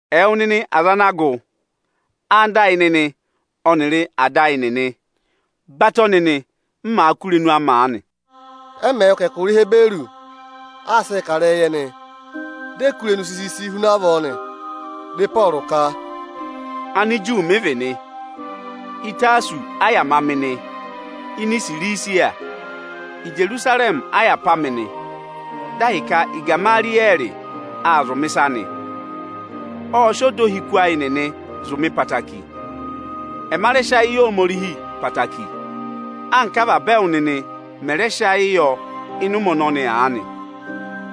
“Ẹwụ nịnị aza ana gụ, anda ayị nịnị ọnịrị ada ayị nịnị, batọ nịnị, m màa kụ́ irenu amị aanị!” Ẹ mẹ̀ wụ́ ka ẹkụra Ihiburu aa sịị kà ịrẹyịị yị ẹnị, di e kú irenu sisisi huna avọọ nị. Dị Ịpọọrụ ka: “Aniju mị vị nị. Ịtasọsị a yà ma mị nị ini Isirisiya. Ijerusarẹmị a yà pá mị; dị ahịka Igamariyẹẹrị aa zụ̀ mị ịsa nị. Ộ sị ọda ohiku ayị nịnị zụ̀ mị ẹtẹẹtẹrẹ. Ẹma rẹ sị ayị yị Ohomorihi ẹtẹẹtẹrẹ, anka avaba ẹwụ nịnị mẹ̀ rẹ sị ayị yọ ịnị ụmẹ ọnọnị aanị.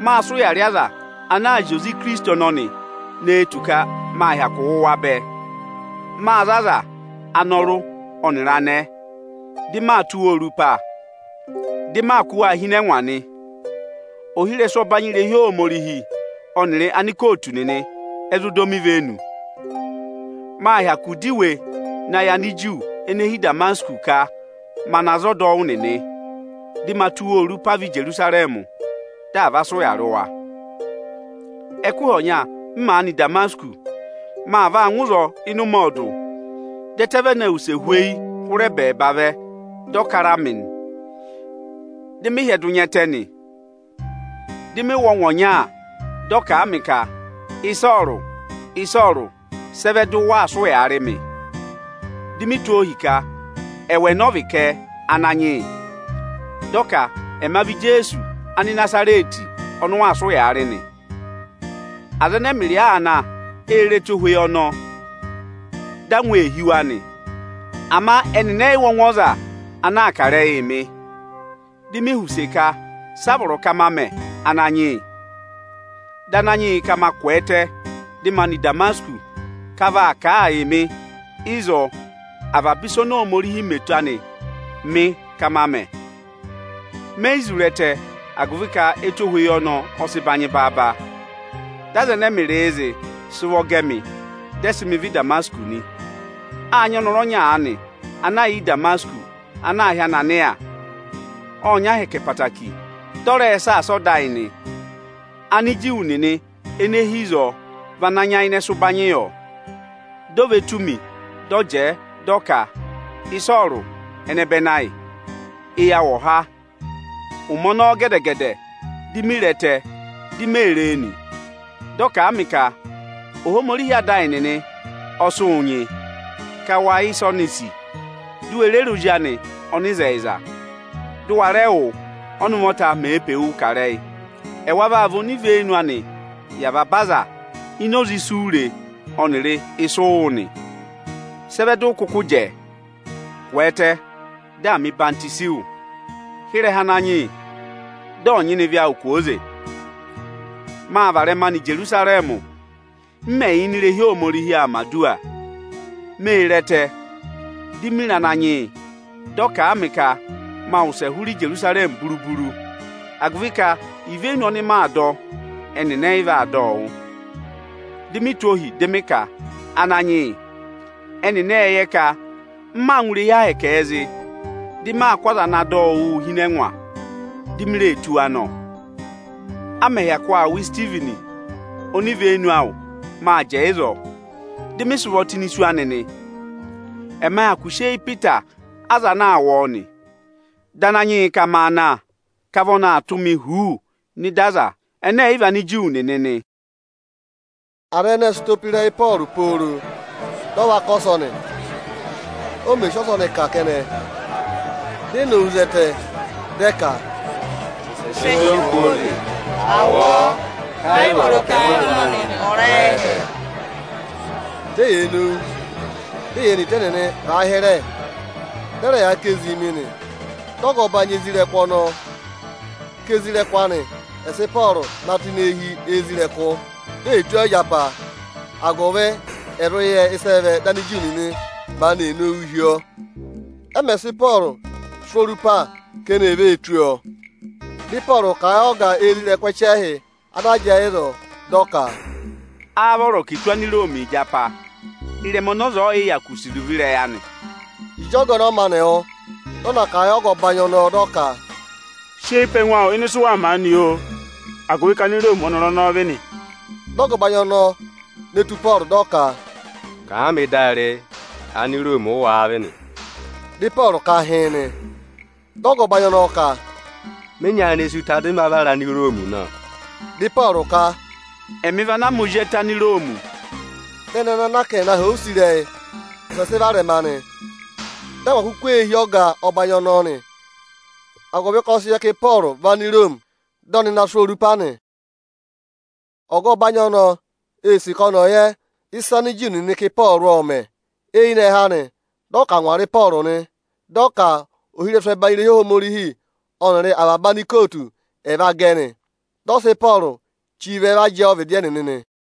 Mâ sị ụya rị aza ana zị oze Ikirisiti ọnọnị ne tù ka mâ hyakụ wụ̀ wa bẹẹ. Mâ za aza, anọrụ ọnịrị anẹẹ, dị maa tụ́ waa orupa, dị maa kụ́ waa hi ịnị ẹngwa nị. Ohirẹsụ ọbanyị irehi Ohomorihi ọnịrị anikootu nịnị ẹ zụ dọ mị ivenu. Mâ hyakụ dọ iwe na yị Aniju ene hi Ịdamasịkọsị ka ma na za ọdọwụ nịnị, dị ma tụ́ wa orupa vẹ Ijerusarẹmị, dị à va sị ụya rị wa.” “Ẹkụhị ọnya, m màa nọ Ịdamasịkọsị, maa vaa ngụ ịzọọ ịnị ụmẹ ọọdụ, dị ẹtẹ vene wuse hweyi hụrẹ ẹbẹẹba vẹ, dị ọ kara mị nị. Dị mị hyẹdụ nya ẹtẹ nị. Dị mị wụ́ ọngwẹ ọnya, dị ọ kà a mị ka: ‘Ịsọọrụ, Ịsọọrụ! Sị ẹ vẹ dị waa sị ụyaa rị mị?’ Di mi tụ́ ohi ka: ‘Ẹwụ, ẹnẹ ọ vị kẹ, Ananyị yị?’ Dị ọ ka: ‘Ẹma vị Ijeesu Anịnazarẹtị ọnị ụ waa sị ụyaa rị nị.’ Aza ẹnẹ ẹmịrịị aa na, ê re ẹtohweyi ọnọọ, dị angwa ee hí wa nị. Ama ẹnịnị ẹ yị wụ́ ọngwẹ ọza ana kà ịrẹyịị mị. Di mi họ̀ use ka: ‘Sị a vọrọ ka ma mẹ, Ananyị yị?’ Dị Ananyị yị ka ma kwẹẹtẹ, dị ma nọ Ịdamasịkọsị ka a vaa kà a yị mị ịzọọ avaba ịsa oni Ohomorihi mẹ eto anịị mị ka ma mẹ. Me yi zụ re ẹtẹ, agụvị ka ẹtohweyi ọnọọ ọ sị banyị baaba, dị aza ẹnẹ ẹmịrịị zị, sị ụvọ gẹ mị, dị ẹ sị mị vẹ Ịdamasịkọsị nị. “Â nyị ọnọrụ ọnya aanị ana yà Ịdamasịkọsị, ana aā hị́ Ananịya. Ộ nyị ahẹkẹ ẹtẹẹtẹrẹ, dị ọ rẹẹ̄ saasa ọda ayị nị. Aniju nịnị ene hi ịzọọ vị ana nyayịnẹ sị ụbanyị yọ. Di o ve tù mi, dị ọ jẹẹ dị ọ ka: ‘Ịsọọrụ, ẹnẹbẹnị ayị, eyi awụ ọ̀ há!’ Ụmẹ ọnọọ gẹdẹ-gẹdẹ, di mi re ẹtẹ, di mee ree nị. Dị ọ kà a mị ka: ‘Ohomorihi ada ayị nịnị ọ sị wụ nyị, ka wa yẹ ịsị oni sì, di u we re re Ozi anị ọnịzẹyịza, dụ wa rẹ wụ́, ọ́nị ụvọta mèe pe wuu kà ịrẹyị. Ẹwa vaa vị onivenu anịị yị avaba aza ini oze isu u re ọnịrị ịsụ ụ wụ́ nị. Sị ẹ vẹ dị ụ kụkụ jẹẹ? Kwẹẹtẹ, dị à mẹ̀ ọyịhwọzenyi wụ; hị́ ịrẹha Ananyị yị, dị ọ̀ nyịna ịvị awụ kwooze!’ “Mâ varẹma nọ Ijerusarẹmị. M mè yà ini irehi Ohomorihi aa mẹ̀ aduwa, mê re ẹtẹ. Di mi re Ananyị yị, dị ọ kà a mị ka maa wụsẹ hụrẹ Ijerusarẹmị buru-buru, agụvị ka ivenu anị ọnị màa dọ, ẹnịnị ẹyị vaa dọ ọ wụ́. Di mi tụ́ ohi, dị mị ka: ‘Ananyị yị, ẹnịnị ệ yẹ ka m maa ngụ irehi Ohomorihii zị, dị maa kụ́ aza ana dọ wụ wụ hi ịnị ẹngwa, di mi ree tụ́ wa nọ! A mẹ̀ hyakụ aa wụ Isitivini onivenu awụ, mâ jẹẹ ịzọọ, dị mị sị ụvọ tụ́ ini isu anị nị. Ẹma hyakụ sị eyi pe ịta aza ana aa wụ ọọ nị.’ Dị Ananyị yị ka maa na, ka vị ọnị aa tụ́ mị huuu nọ ịda Anigiriki nịnị nị.” Aza ẹnẹẹ ệ sị ụtọ pe ịrẹyị Ịpọọrụ pooro dị ọ va kà ọsọnị. Ọ mẹ̀ sị ọsọnị kà kẹnẹ, di e nowu zẹtẹ, dị ẹ ka, “Wụsẹ sị ọọ kwooze! À wụ ọọ, ka ẹ yị vọrọ ka ẹngụ ọza ọnọnị ọ̀ ra ẹ́hẹ!” Di eyee nowu, di eyee ne ịta ẹnịnị vàa hịrẹ, dị ẹ rẹ yaa ká ezii mi nị. Dị ọga ọbanyị isoja nịnị ọnọọ ka isoja nịnị anị ẹ̀ sị Ịpọọrụ na tụ́ ini eehi isoja nịnị, di e tụ́ ọọ ịjapa, agụvị ẹ̀ zụ yẹ ịsị ẹ vẹ dị Aniju nịnị maanị ee nowuu hi ọọ. Ẹ mẹ̀ sị Ịpọọrụ sụ́ orupa ka eni è ve tụ́ ọọ, dị Ịpọọrụ kà a yị ọga isoja nịnị ẹchẹhị ana jẹẹ ịzọọ, dị ọ ka, “Áá vọrọ ka è tụ́ Aniroomi ịjapa, ịrẹma ọnị ọza ọọ̀yị hyakụ sì iruvo ịrẹyị anị?” Ịjị ọga ọnọọ maanị wụ́, dị ọ na kà a yị ọga ọbanyị ọnọọ, dị ọ ka, “Sị eyi pe ẹngụ awụ ịnị ịsụ waa mẹ aanị, oo, agụvị ka Aniroomi ọ́nọrụ ọnọọ vị nị.” Dị ọga ọbanyị ọnọọ ne tù Ịpọọrụ, dị ọ ka, “Kàa mị dị a re, Aniroomi ụ wáá vị nị?” Dị Ịpọọrụ ka hịịn nị. Dị ọga ọbanyị ọnọọ ka, “Mị nyayịnẹ sí ụta, dị mị va vara Aniroomi nọ!” Dị Ịpọọrụ ka, “Ẹmị vị anaa ma ozi ẹtẹ Aniroomi.” Dị ẹnị anaa ka ẹ̀ na họ̀ ọ use ịrẹyị, wụsẹ sị varẹma nị. Dị angwa kuku ee hí ọga ọbanyị ọnọọ nị, agụvị ka ọ sị yẹ ka Ịpọọrụ vị Aniroomi, dị ọnị na sụ́ ọọ orupa nị. Ọga ọbanyị ọnọọ ee sì ka ọnị ọ̀ yẹ ịsị Aniju nịnị ka Ịpọọrụ ộ mẹ̀. Eyinẹhẹ anị, dị ọ ka à ngwara Ịpọọrụ nị. Dị ọ ka ohirẹsụ ẹbanyị irehi Ohomorihi ọnịrị avaba anikootu ẹ̀ va gẹ nị. Dị ọ sị Ịpọọrụ chí va jẹẹ ọvịdị ẹnịnị nị.